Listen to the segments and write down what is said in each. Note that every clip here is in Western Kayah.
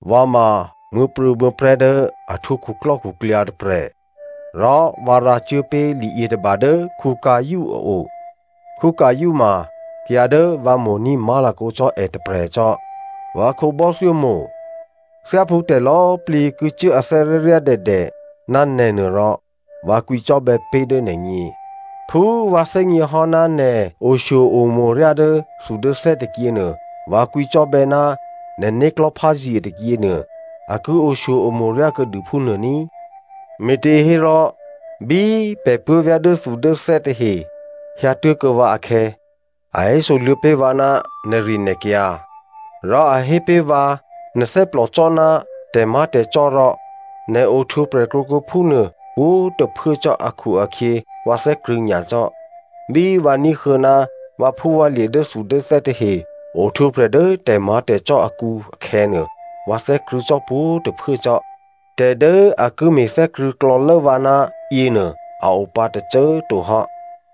Vǎ ma muố̤prû̌muố̤prè̤́ dố a htwǒ khuklò́khuklyǎ tôprè̤ rò vǎ rǎcuốpé̤ liyětôba dố Gaio a o꤮. Gaio ma kayǎ dố vǎ mo̤ní̤ má̤lakǒ cò́ è tôprè̤ cò́. Vǎ khǒbò́thyó mo̤꤮, thyáphú tè̤lò̌꤮ plǐ ki cuố athè́ ryáryádèdè ná nè̤nuô rò, vǎ kwǐcò́bè̌ pé̤ dố nè̤gně. Phú vǎ thè́gněhò́ ná nè̤ oshyo-omo̤ ryá dốthudốthè́ tôkyěnuô, vǎ kwǐcò́bè̌ ná nè̤ né̤klò̤́ pházye tôkyěnuô, a ki oshyo-omo̤ ryá kuô̌dû phúnuô ní꤮. Me̤těhérò bí pè̤ puố̤vyá̤ dốthudốthè́ tahe hyǎtuố̤kuô̌ vǎ akhè̌, a hésoluô̌ pé̤ vǎ ná nè̤rinè̤kyǎ. Rò a hé pé̤ vǎ, nè̤ thè́plòcò́ ná tè̤má̤tè̤cò́ rò nè̤ ohtwǒprè̤ krwǒkuô̌ phúnuô pwǒ̤꤮ tôphuố cò́ akhu-akhyě vǎ thè́krṳ̂̌ nyacò́. Bí vǎ ní̤huô̌ ná vǎphúvǎlye̤ dốthudốthè́ tahe ohtwǒprè̤ dố tè̤má̤tè̤cò́ akǔ akhè̌nuô, vǎ thè́krṳ̂̌ cò́ pwǒ̤꤮ tôphuố cò́. Tè̤ dố a ki me̤thè́krṳ̂̌ klò̌lố vǎ ná yěnuô a o pǎ tôcô꤮ to hò́.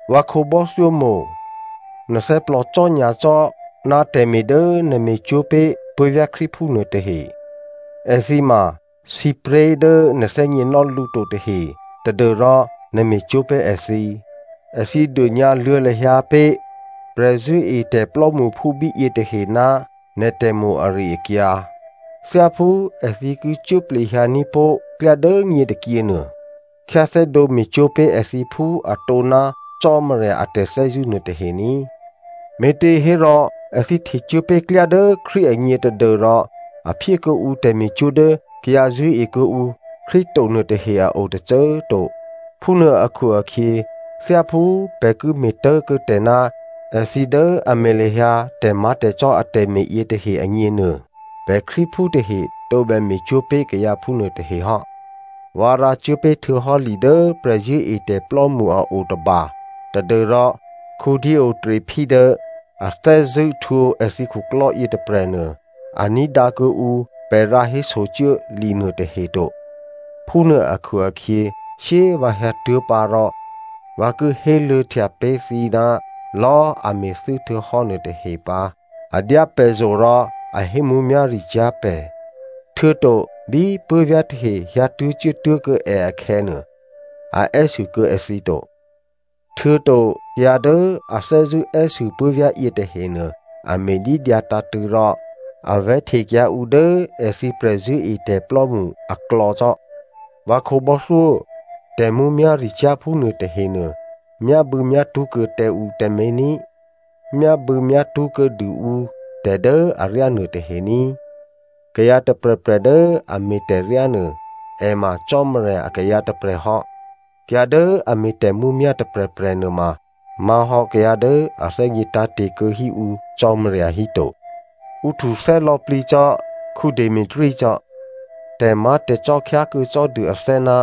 Vǎ khǒbò́thyó mo̤, nè̤ thè́plòcò́ nyacò́ ná tè̤me̤ dố nè̤ me̤cwó̤ pé̤ puố̤vyá̤ Krístuphú nuô tahe. Èthǐ ma sǐpré̤ dố nè̤ thè́gněnò́ lǔ to tahe tadû́rò nè̤ me̤cwó̤ pé̤ èthǐ. Èthǐ dônyǎluô̌ lahyǎ pé̤ prè̤zṳ̂́etè̤ plò́mṳphú bíyě tahe ná nè̤ tè̤mo̤ ari-akyǎ. Thyáphú èthǐ ki cuố plehyǎ ní̤pó̤ klyá dố nyě tôkyěnuô, khyáthè́dǒ me̤cwó̤ pé̤ èthǐ phú atǒ ná Cò́marya a tè̤thè́zṳ̂́ nuôtahe ní꤮. Me̤těhérò èthǐ htecuố pé̤ klyá dố Krístu agně tadû́rò a phyé kuô̌ǔ tè̤me̤cwó̤ dố kayǎ zṳ̂́e kuô̌ǔ Krístu to nuôtahe a o tôcô꤮ to. Phúnuô akhu-akhyě, thyáphú pè̤ ki me̤ tố̤kuô̌tè̤ ná èthǐ dố a me̤ lahyǎ tè̤má̤tè̤cò́ atè̤me̤ yětahe agněnuô, pè̤ Krístuphú tahe tǒbè me̤cwó̤ pé̤ kayǎ phúnuô tahe hò́. Vǎ rǎcuố pé̤ htuô̌hò́ li dố prè̤zṳ̂́etè̤plò́mṳ a o tôba tadû́rò Diotrephe dố a thè́zṳ̂́ htwǒ èthǐ khuklò́ yětôprè̤nuô, a ní̤dǎ kuô̌ǔ pè̤ rǎhésocuố linuô tahe to. Phúnuô akhu-akhyě shyé꤮ vǎ hyǎtuố̤ pǎ rò vǎ ki héluô̌htya pé̤ thǐ ná lò̌꤮ a me̤thû́ htuô̌hò́ nuôtahe pǎ. A dyá pè̤zo̤ rò a hé mǔmyá̤ricyá̤ pè̤, htuô̌to bí puố̤vyá̤ tahe hyǎtuố̤ cuốtuố̤kuô̌ è akhè̌ nuô a è́sû kuô̌ èthǐ to. Htuô̌to kayǎ dố a thè́zṳ̂́ è́sû puố̤vyá̤ yětahenuô a me̤dídyǎ tǎ̤tṳ̂̌ rò a vè̤́htekyǎ ǔ dố èthǐ prè̤zṳ̂́etè̤plò́mṳ aklò̌ cò́. Vǎ khǒbò́thyó꤮, tè̤mǔmyá̤ricyá̤ phúnuô tahenuô myábû̌myátṳ́ kuô̌ tǎ ǔ tǎmé̤ ní꤮. Myábû̌myátṳ́ kuô̌dû ǔ tè̤ dố aryá nuôtahe ní꤮. Kayǎ tôprè̤prè̤ dố a me̤ tè̤ryánuô, è ma Cò́marya akayǎ tôprè̤ hò́. Kayǎ dố a me̤ tè̤mǔmyá̤ tôprè̤prè̤ nuôma má̤hò́ kayǎ dố a thè́gně tǎ̤te̤ kuô̌ hí ǔ Cò́marya híto. Ǔ htuthè́ lò̌plǐ cò́ Demetrio cò́. Tè̤má̤tè̤cò́ khyákuô̌ cò́dû athè́ ná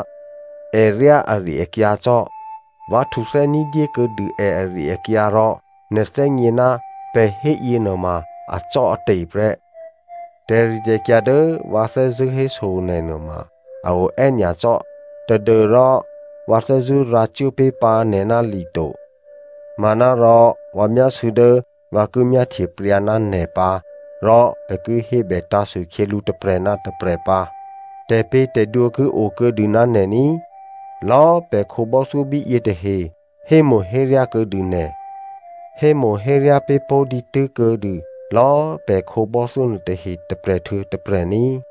è ryá ari-akyǎ cò́. Vǎ htuthè́ ní̤dyé kuô̌dû è ari-akyǎ, rò nè̤ thè́gně ná pè̤ héyě nuôma acò́ate̤ prè́. Tè̤ritè̤kyǎ dố vǎ thè́zṳ̂́ héso nè̤ nuôma a o è́nyacò́ tadû́rò vǎ thè́zṳ̂́ rǎcuố pé̤ pǎ nè̤ ná li to. Manárò vǎ myásû̌ dố vǎ ki myáhtye pryǎ ná nè̤ pǎ rò pè̤ ki hébètǎ̤sû khyělǔ tôprè̤ ná tôprè̤ pǎ. Tè̤pě̤tè̤dwǒ ki okuô̌dû ná nè̤ ní꤮. Lò̌꤮ pè̤ khǒbò́thyó bíyě tahe hémo̤héryá kuô̌dû nè̤. Hémo̤héryá pé̤ pó̤ dǐtû́ kuô̌dû lò̌꤮ pè̤ khǒbò́thyó nuôtahe tôprè̤ htuô̌ tôprè̤ ní꤮.